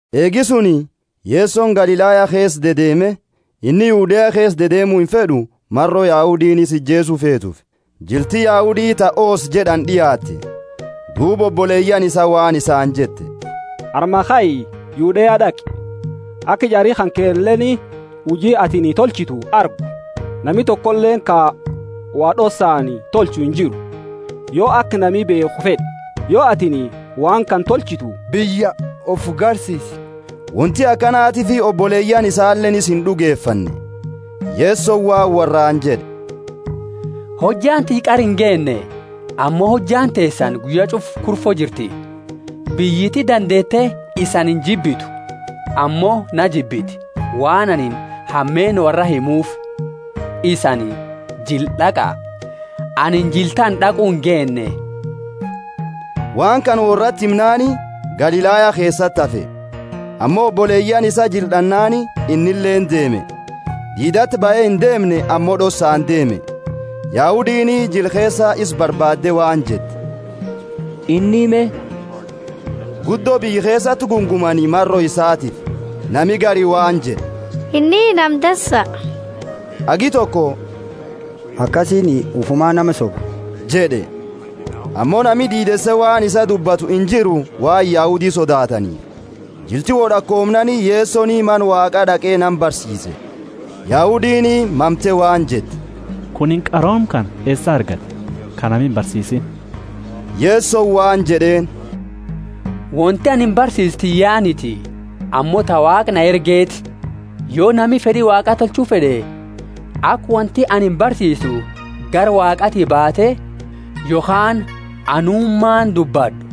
Eegi suni, Yesoni Galilaya keesa dedeeme; inni Yudea keesa dedeemu imfed'u, maro Yahudiini isa ijeesu feetuufi jilti Yahudi ta Hoosa jed'ani d'iaatte. Duuba oboleyaani isaa waan isaani jette, Armaa kai, Yudea d'aqi, aka jari kankeleeni huji atini tolchitu argu. Nami tokoleeni ka wo d'ossaani tolchu injiru, yo aka nami beekhu fed'e. Yo atini waan kana tolchitu, biyya ufi garsiisi! (Wonti akanatiifi oboleyaani isaleeni isa ind'ugefanne.) Yesoni waan worraani jed'e, Hojjaani tiyya qara ingeenne, ammo hojjaani teesani guyya ch'ufa kurfo jirti. Biyyiti dandeete isani injibitu, ammo na jibbiti, waan anini hameenna worraa himuufi. Isani jila d'aqa, anini jila tana d'aqu ingeenne. Waan kana worrati himnaani, Galilaya keesati hafe. Ammo oboleyaani isaa jila d'annaani, innileeni deeme, diidati bahe indeemne ammo d'ossaani deeme Yahudiini jila keesa isa barbaadde waan jette, Inni me? Guddo biyya keesati gungumani maro isatiifi, Nami gari waan jed'e, Inni nama dansa, hagi toko, Akasiiniti, ufuma nama soba jed'e. Ammo nami diideese waan isaa dubbatu injiru, waan Yahudi sodaataniifi. Jilti wod'akoomnaani Yesoni Mana Waaqa d'aqe nama barsiise. Yahudiini mamte waan jette, Kunini qarooma kana eesaa argate, ka nami imbarsiisiini? Yesoni waan jed'eeni, Wonti anini barsiisu tiyyaaniti, ammo ta Waaqa na ergeti. Yo nami fed'i Waaqa tolchu fed'e, aka wonti ani barsiisu gara Waaqati baate yokhaani anumaani dubbad'u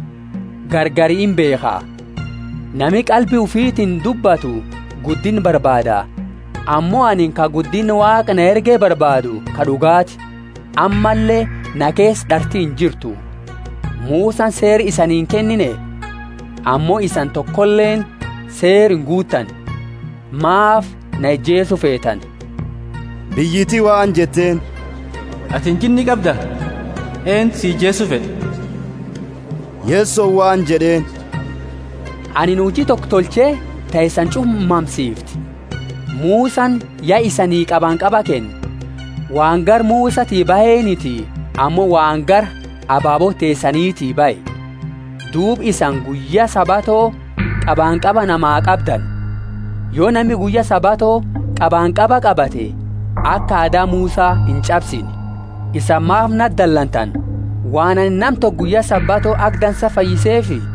gargari imbeekha. Nami qalbi ufiitini dubbatu guddinna barbaada. Ammo anini ka guddinna Waaqa na erge barbaadu ka d'ugaati; ammalle na keesa d'arti injirtu. Musani Seera isanii inkennine? Ammo isani tokoleeni Seera inguuttani. Maafi na ijeesu feetani? Biyyiti waan jetteeni, Atini jinni qabda! Eentu si ijeesu fed'a? Yesoni waan jed'eeni, Anini huji toko tolche ta isani ch'ufa mamsiifte. Musani ya isanii qabanqaba kenne (waan gara Musati baheniti ammo waan gara ababoota teesaniti bahe), duuba isani guyya Sabato qabanqaba namaa qabdani. Yo nami guyya Sabato qabanqaba qabate, aka aada Musa inch'absine, isani maafi nati dalantani, waan anini nama toko guyya Sabato aka dansa fayyiseefi?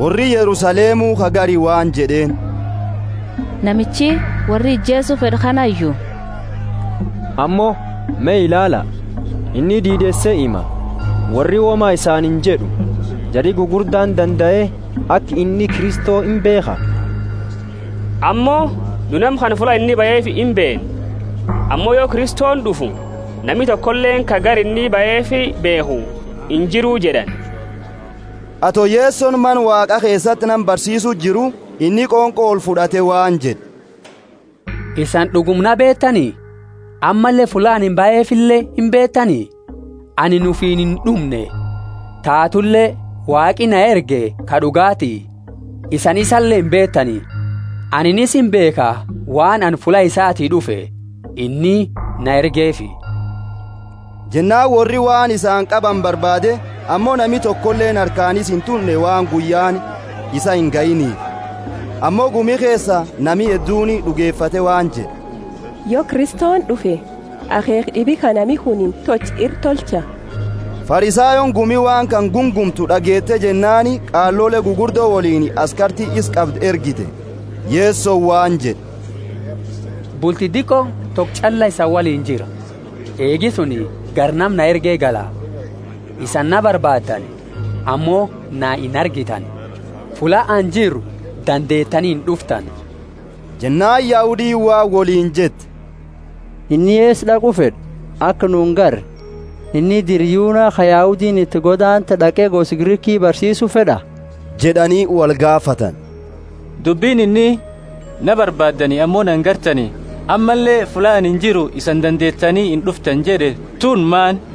Worri Yerusalemu ka gari waan jed'eeni, Namichi worri ijeesu fed'u kanayu? Ammo, me ilaala, inni diideese hima, worri woma isaani injed'u. Jari gugurdaani dandae aka inni Kristo imbeekha? Ammo nu nama kana fulla inni bahefi imbeenna; ammo yo Kristoni d'ufu nami tokoleeni ka gara inni bahefi beekhu injiru jed'ani. Ato Yesoni Mana Waaqa keesati nama barsiisuu jiru, inni qonqo olfud'ate waan jed'e, Isani d'uguma na beetani? Ammalle fulla anini bahefile imbeetani? Anini ufiini ind'umne, taatule Waaqi na erge ka d'ugaati, isani isale imbeetani. Anini isa imbeekha, waan ani fulla isaati d'ufe, inni na ergeefi. Jennaani worri waan isaani qabani barbaade, ammo nami tokoleeni harkaani isa intunne waan guyyaani isaa ingayiniifi. Ammo gumi keesa nami hedduuni d'ugefate waan jed'e, Yo Kristoni d'ufe, akheekha d'ibi ka nami kuni tolche ira tolcha? Farisayooni gumi waan kana gungumtu d'ageete jennaani qaalole gugurdo woliini askarti isa qabdu ergite. Yesoni waan jed'e, Bulti diqo toko ch'alla isani woliini jira, eegi suni gara nama na erge gala. Isani na barbaaddani, ammo na inargitani, fulla ani jiru dandeetani ind'uftani. Jennaani Yahudiini waan woliini jette, Inni eesa d'aqu fed'a, aka nu ingarre? Inni dira Yuna ka Yahudiini iti godaante d'aqe gosa Griki barsiisu fed'a? jed'ani wolgaafatani. Dubbini inni, Na barbaaddani ammo na inargitani, ammalle fulla ani jiru isani dandeetani ind'uftani jed'e tuni maani?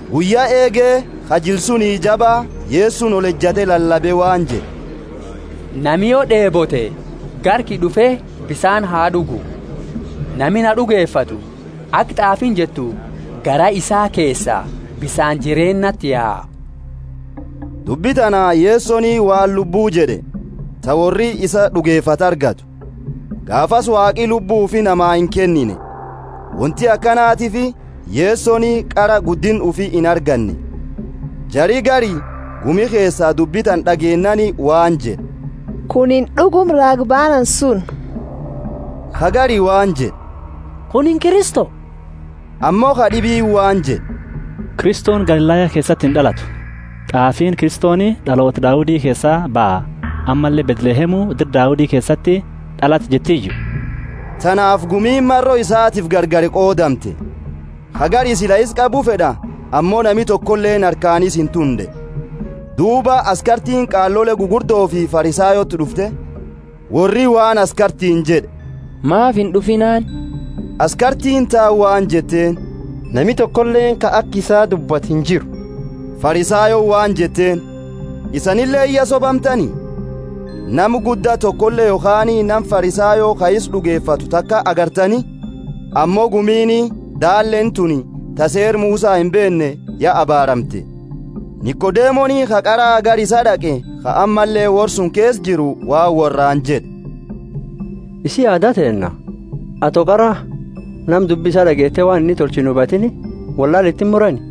Guyya eege, ka jila suni jaba, Yesoni olejate lalabe waan jed'e, Nami yo d'eebote, gara kiyya d'ufe bisaani ha d'ugu. Nami na d'ugefatu, aka t'aafiini jettu, garaa isaa keesaa bisaani jireennati yaa. Dubbi tana Yesoni waan Lubbu jed'e, ta worri isa d'ugefatu argatu. Gaafasi Waaqi Lubbu ufi nama inkennine, wonti akanatiifi Yesoni qara guddinna ufi inarganne. Jari gari gumi keesa dubbi tana d'ageennaani waan jed'e, Kunini d'uguma raaga baanani suni! Ka gari waan jed'e, Kunini Kristo! Ammo kad'ibiini waan jed'e, Kristoni Galilaya keesati ind'alatu. T'aafiini, Kristoni d'aloota Daudi keesaa baha, ammalle Bethlehemu, dira Daudi keesati d'alata jettiyu? Tanaafi gumiini maro isatiifi gargari qoodamte. Ka gari sila isa qabu fed'a, ammo nami tokoleeni harkaani isa intunne. Duuba askartiini qaalole gugurdofi Farisayooti d'ufte. Worri waan askartiini jed'e, Maafi ind'ufiinaani? Askartiini taani waan jetteeni, Nami tokoleeni ka aka isaa dubbatu injiru. Farisayooni waan jetteeni, Isanileeni ya sobamtani? Nama gudda tokole yokhaani nama Farisayo ka isa d'ugefatu taka agartani? Ammo gumiini daalleeni tuni ta Seera Musa imbeenne ya abaaramte. Nikodemoni ka qara gara isaa d'aqe, ka ammalle worra suni keesa jiru, waan worraani jed'e, Isii aada teenna, ato qara nama dubbi isa d'ageete waan inni tolche inhubatiini wollaala iti imurani?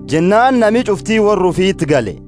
Jennaani nami ch'ufti worra ufiti gale.